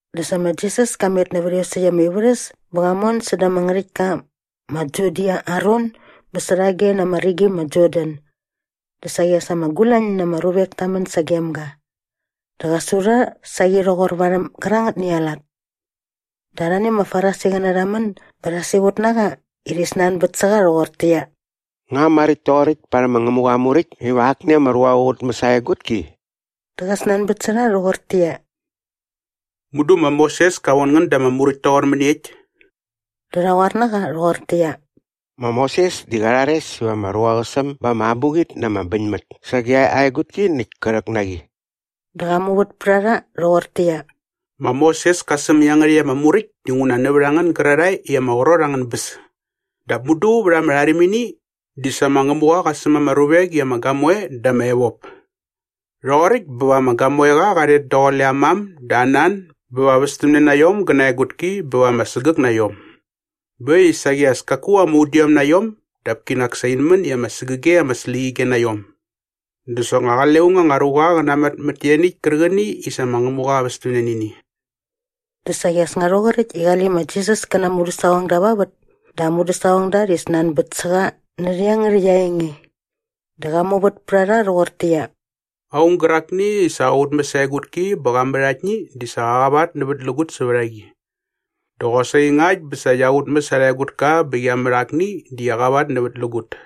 Dä sa ma Jisas ka met nävät iosäkt ama ivärhäs bä qa mon säda ama ngärhäktka ma Judia aa ron bä särhage na ama rigi ma Jordan. Dä saqi as ama gulañ na ama ruvek ta män sagem ga. Dä qä su rha saqi rhoqor varhäm gärangätni aa lat. Dä arhani ama Farisiqäna rha män bä rha siqut na qa i rhi snanbät sä qa rhoqortäqyia, “Nga maräkt toqoräkt parhäm ma Ngämuqa aa Muräkt iva akni ama ruqa qä qutmäs aa egutki?” Dä qa snanbät sä rha rhoqortäqyia, “Mudu ma Moses ka von ngän da ama muräkt toqor mäniekt?” Dä rha qoar na qa rhoqortäqyia, “Ma Moses di qa rhares iva ama ruqa qä säm ba ama abuqit na ama bäñmät sage aa egutki näkt kä rhäk na qi.” Dä qa muvät pät a rha rhoqortäqyia, “Ma Moses ka säm iangärhäkt ama muräkt dinguna nävät a ngän gärarhae i ama qrot angän bäs. Dap mudu vät ama rharimini di ‘sa ma Ngämuqa qa säm ama ruvek i ama gamoe dä ama evop.’ ‘Rhoqoräkt bä va ama gamoeqa qa rhet daqule aa mam dä aa nan bä va västämne na iom gä na aa egutki bä va sägäk na iom.’ Bä äkt i saqi as kaku ama udiom na iom dap kinak sa in män i ama sägäge ama släqyige na iom. Dä soknga qale aung anga ruqa qä namat mät ianiäkt kärqäni i sa ma Ngämuqa qa västämne nä ini.” Dä saqi as nga rhoqoräkt i qale ma Jisas kä na aa mudäsaqongda va vät dä aa mudäsaqongda rhi snanbät sä qa närhä iangärhäkt aa enge. Dä qa muvät pät a rha rhoqortäqyia, “Aung gärakni i sa qa qutmäs aa egutki bä qa mät aktni di qä qavatnävätlägut sävät a qi. Dä qosaqi ngakt bä sa qia qutmäs arha egutka bä qia mät akni di qi qavatnävätlägut.”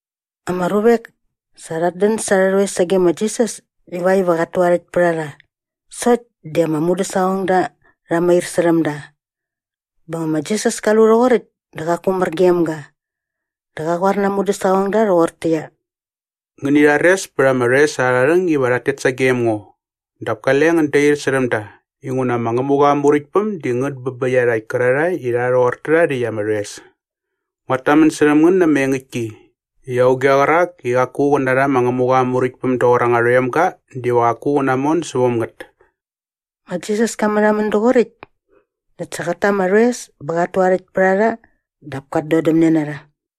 Ama ruvek sa rhat dän sa arhä rhoes sage ma Jisas ivakt iva qat tu aa rhäkt pät a rha. Sokt di ama mudäsaqongda rha mair särhäm da. Bä nga ma Jisas ka lu rhoqoräkt dä qaku mär gem ga. Dä qa qoar na aa mudäsaqongda rhoqortäqyia, “Ngäni rhares pät ama rhoes arha rhäng iva rhat tet sagem ngo dap kale ngän dair särhäm da inguna ma Ngämuqa aa Muräktpäm di ngät bä bä iarhakt kärarhae i rha rhoqor tärha rhäkt ama rhoes. Nguat tamän särhäm ngän na ama engäktki i auge qärak i qaku qä narha ma Ngämuqa aa Muräktpäm doqor anga rhoemga diva qaku qä namon säväm ngät.” Ma Jisas ka märhamän doqoräkt näkt sa qät ta ama rhoes bä qat tu aa rhäkt pät a rha dap kat dodämne na rha.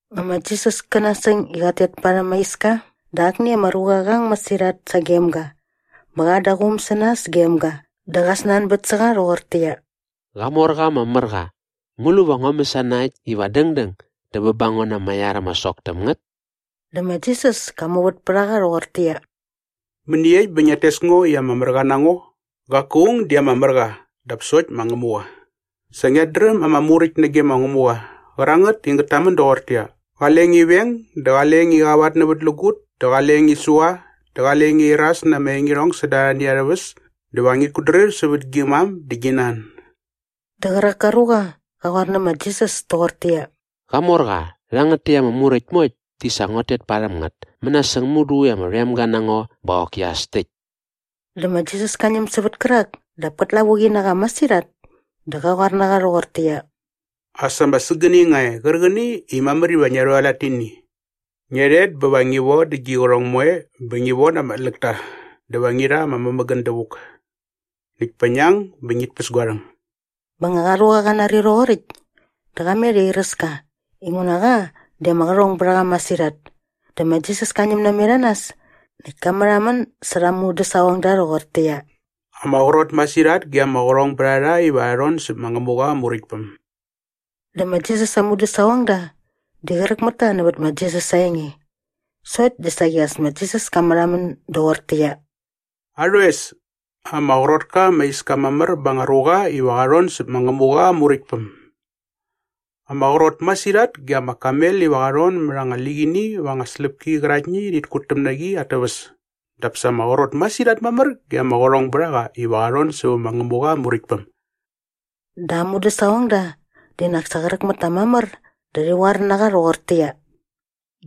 Nga ma Jisas kä nasäng i qat tet parhäm aa iska dä akni ama ruqa qa ang masirhat sagem ga bä qa an da aa quum sä nas gem ga dä qa snanbät sä qa rhoqortäqyia, “Qamorqa ama mär qa, ngu lu va ngua mäsana äkt iva dängdäng dä bä ba ngo na ama iar ama sok täm ngät?” Dä ma Jisas ka muvät pät a qa rhoqortäqyia, “Mäniekt bä ngiat tes ngo i ama mär qa na ngo? Qaku aung di ama mär qa dap sokt ma Ngämuqa. Sa ngiat dräm ama Muräkt nage ma Ngämuqa qärangät i ngät tamän doqortäqyia, ‘Qale ngi veng dä qale ngi qavatnävätlägut dä qale ngi sua dä qale ngi iras na anga engirhong säda arhani arhä väs dä va ngit kutdrir sävät gi mam dä gi nan.’” Dä qärak ka ruqa qa qoar nä ma Jisas toqortäqyia, “Qamorqa, rhangät täkt ama muräkt moekt di sa nguat tet parhäm ngät mänasäng mudu i ama rhoemga na ngo bä qoki as täkt.” Dä ma Jisas ka ñäm sävät kärak dap kät lavuqi na qa masirhat dä qa qoar na qa rhoqortäqyia, “As ama sägäni nga e qärqäni i mamär iva ngia rhualat nä ini. Ngia rhet bä va ngi vodä gi qärhong moe bä ngi von ama tläkta dä va ngi rha ama mämägän dävuk. Näkt pa ngi ang bä ngit päs gua rhäng.” Bä nga qa ruqa qa nari rhoqoräkt dä qa met i airäs ka inguna qa di ama qärhong bät a qa masirhat. Dä ma Jisas ka ñäm namet a nas näkt ka märhamän särha aa mudäsaqongda rhoqortäqyia, “Ama qrot masirhat ge ama qärhongbärharha iva rha rhon säp ma Ngämuqa aa Muräktpäm.” Dä ma Jisas aa mudäsaqongda di qräk mät ta nävät ma Jisas aa enge. Sokt di saqi as ma Jisas ka märhamän doqortäqyia, “Arhoes, ama qrot ka ama iska mamär ba anga ruqa iva qa rhon säp ma Ngämuqa aa Muräktpäm. Ama qrot masirhat ge ama kamel iva qa rhon mät anga liqini va anga släpki qäraktni i rhit kutäm na qi at täväs dap sa ama qrot masirhat mamär ge ama qärhongbärhaqa iva qa rhon sävä ma Ngämuqa aa Muräktpäm.” Dä aa mudäsaqongda di nak sa qräk mät ta mamär dä rhi qoar na qa rhoqortäqyia,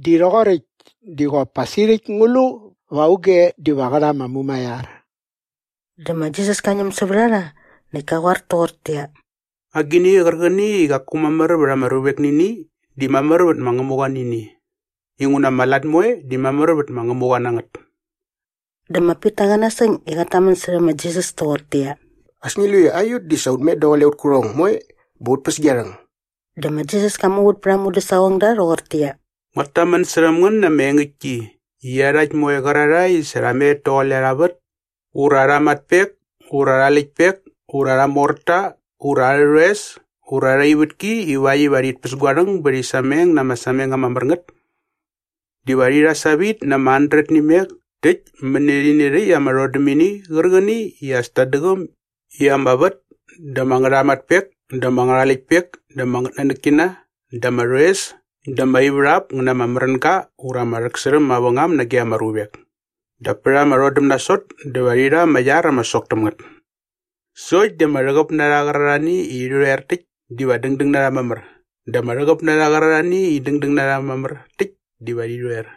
“Di rhoqoräkt di qop pa sirhäkt ngu lu va auge diva qä rha ama mumaiar?” Dä ma Jisas ka ñäm sävät a rha näkt ka qoar toqortäqyia, “Agini qärqäni i qaku mamär vät ama ruvek nä ini di mamär vät ma Ngämuqa nä ini. Inguna ama lat moe di mamär vät ma Ngämuqa nä ngät.” Dä ma Pita qa nasäng i qat tamän särhä ma Jisas toqortäqyia, “As ngi lu i aiut di sa ut met daqule aut kärhong moe bä ut päs gia rhäng!” Dä ma Jisas ka muvät pät aa mudäsaqongda rhoqortäqyia, “Nguat tamän särhäm ngän na ama engäktki i iarhakt moe qärarhae i sa rha met daqule arha vät ura arha matpek ura arha läktpek ura arha morta ura arhä rhoes ura arha ivätki ivakt iva rhit päs gua rhang bä rhi sameng na ama sameng ama mär ngät diva rhi rha savit na ama handret nä imek täkt mäni rhäni rhäkt ama rhodämini qärqäni i as tat däqäm i ama vät dä ama ngärhamatpek dä ama ngärhaläktpek dä ama ngätnanäkkina dä ama rhoes dä ama ivärhap ngä na ama märänga ura ama rhäksärhäm mavängam nage ama ruvek. Dap pät ama rhodäm nasot dä va rhi rha ama iar ama sok täm ngät. Sokt di ama rhäqäp na rha qärarhani i rhi rhoer täkt diva dängdäng na rha mamär dä ama rhäqäp na rha qärarhani i dängdäng na rha mamär täkt diva rhi rhoer.”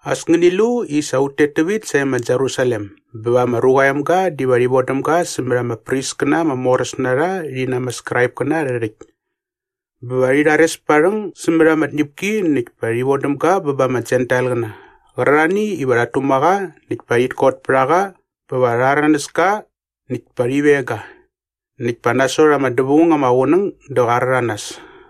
“As ngäni lu i sa ut tet tävit sae ma Jerusalem bä va ma Ruqa aa Emga diva rhi vodäm ga sämät ama priskäna ama moräs na rha rhi na ama Skraipkäna arhä rhäkt. Bä va rhi rhares pät aa rhäng sämät ama tñäpki näkt pa rhi vodäm ga ba ama Jentailqäna qärarhani iva rhat tuma qa näkt pa rhit kot pät a qa bä va rha rhäranäs ka näkt pa rhi veng ga. Näkt pa nasot ama dävaung ama qunäng dä qa rhäranas.”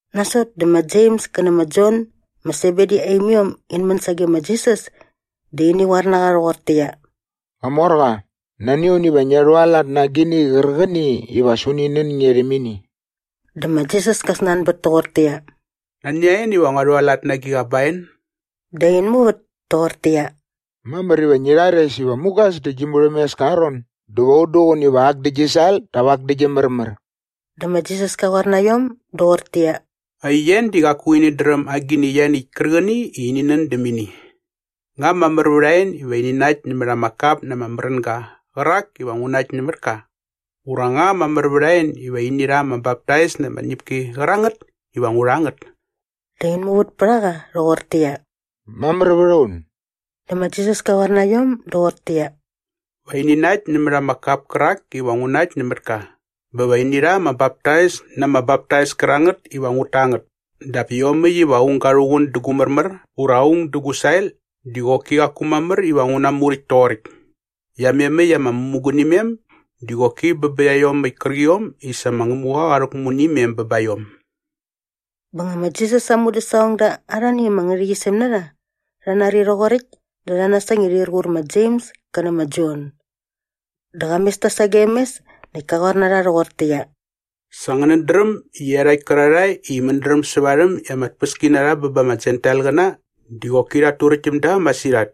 Nasot dä ma Jems kä nä ma Jon ma Sebedi aa imiom in män sage ma Jisas dä ini qoar na qa rhoqortäqyia, “Qamorqa, nani a un iva ngia rhualat na agini qärqäni iva as uni nän nge rhäm ini.” Dä ma Jisas ka snanbät toqortäqyia, “Nani a en iva ngua rhualat na agiqa ba en?” Dä in muvät toqortäqyia, “Mamär iva ngi rhares iva mugas dä gi murhämeska aa ron dä va un duqun iva ak dä gi sael dap ak dä gi märmär.” Dä ma Jisas ka qoar na iom doqortäqyia, “Aien di qaku inät dräm agini ianiäkt kärqäni i ini nän däm ini. Nga mamär vät a en iva ini nakt nämät ama kap na ama märänga qärak iva ngu nakt nämät ka ura nga mamär vät a en iva ini rha ama baptais na ama tñäpki qärangät iva ngu rha ngät?” Dä in muvät pät a qa rhoqortäqyia, “Mamär vät a un.” Dä ma Jisas ka qoar na iom doqortäqyia, “Va ini nakt nämät ama kap kärak iva ngu nakt nämät ka bä va ini rha ama baptais na ama baptais kärangät iva ngut ta ngät dap iomäkt iva aung ga rhuqun dä gu märmär ura aung dä gu sael di qoki qaku mamär iva ngu namuräkt toqoräkt. Iamemäkt ama mämugunimem di qoki bä bä iaiomäkt kärqiom i sa ma Ngämuqa qa rhäkmu nä imem bä ba iom.” Bä nga ma Jisas aa mudäsaqongda arhani ama ngärhäqyisem na rha rha nari rhoqoräkt dä rha nasäng i rhir qur ma Jems kä nä ma Jon. Dä qa mes ta sagem mes näkt ka qoar na rha rhoqortäqyia, “Sa ngänät dräm i iarhakt kärarhae i mädräm sä varhäm i ama tpäskinarha bä ba ama Jentailqäna di qoki rhat turäkt täm da masirhat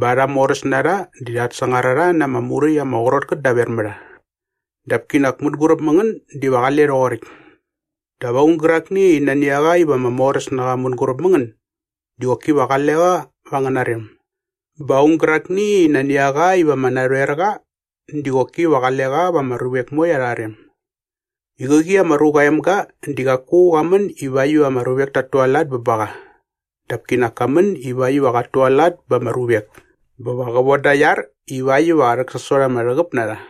bä arha moräsnarha di rhat sangar a rha na ama muräkt ama qrot ngät daver mä rha. Dap kinak mänguräp mä ngän diva qale rhoqoräkt. Dap aung gärakni i nani a qa iva ama moräs na qa mänguräp mä ngän di qoki va qale qa va angäna rem bä aung gärakni i nani a qa iva ama narhoer qa di qoki va qale qa va ama ruvek moe arha rem. I qäqi ma Ruqa aa Emga di qaku qa män ivakt iva ama ruvek tat tualat bä ba qa dap kinak ka män ivakt iva qat tualat ba ama ruvek bä va qä voda aa iar ivakt iva qä rhäksasot ama rhäqäp na rha.”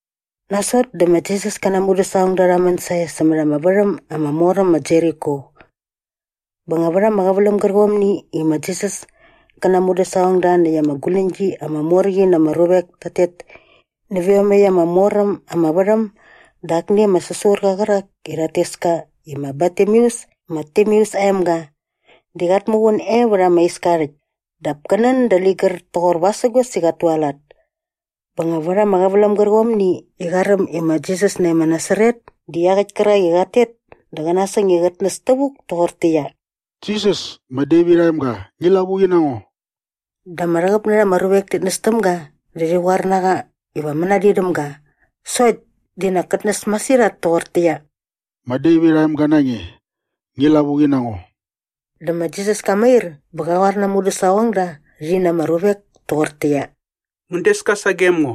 Nasot dä ma Jisas kä na aa mudäsaqongda rha män sae sämät ama värhäm ama mor äm ma Jeriko. Bä nga vät ama qäväläm gärqomni i ma Jisas kä na aa mudäsaqongda näkt ama guläñgi ama mor qi na ama ruvek tat tet nävä iomäkt ama mor äm ama värhäm dä akni ama säsurqa qärak i rhat tes ka i ma Bartimeus ma Timeus aa emga di qat muqun e vät ama iska aa rhäkt dap kä nän dä ligär toqor vasägos i qat tualat. Bä nga vät ama qäväläm gärqomni i qa räm i ma Jisas nae ma Nasaret di iaqäkt kärak i qat tet dä qa nasäng i qät näs tävuk toqortäqyia, “Jisas ma Devit aa emga, ngi lavuqi na ngo.” Dä ama rhäqäp na rha ama ruvek tit näs täm ga dä rhi qoar na qa iva mänadin däm ga sokt di nak kät näs masirhat toqortäqyia, “Ma Devit aa emga na nge, ngi lavuqi na ngo.” Dä ma Jisas ka mair bä qa qoar na aa mudäsaqongda rhi na ama ruvek toqortäqyia, “Ngän des ka sagem ngo.”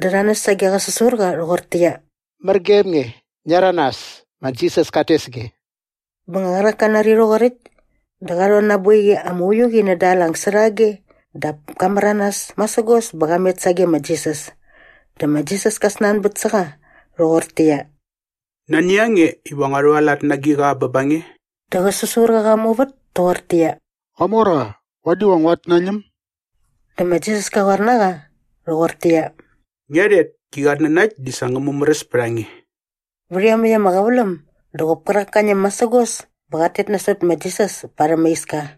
Dä rha näs sage qä säsurqa rhoqortäqyia, “Mär gem nge! Ngia rhäranas! Ma Jisas kat tes nge!” Bä nga qärak ka nari rhoqoräkt dä qa rhon na aa boiqi ama uiu qi näda aa lang särhage dap ka märanas masägos bä qa met sage ma Jisas. Dä ma Jisas ka snanbät sä qa rhoqortäqyia, “Nani a nge iva ngua rhualat na agiqa bä ba nge?” Dä qä säsurqa qa muvät toqortäqyia, “Qamorqa, vadi va nguat nañäm.” Dä ma Jisas ka qoar na qa rhoqortäqyia, “Ngia rhet, gi qatnanakt di sa ngä mumäräs pät a nge.” Vät iomäkt ama qäväläm dä qop kärak ka ñäm masägos bä qat tet nasot ma Jisas parhäm ama iska.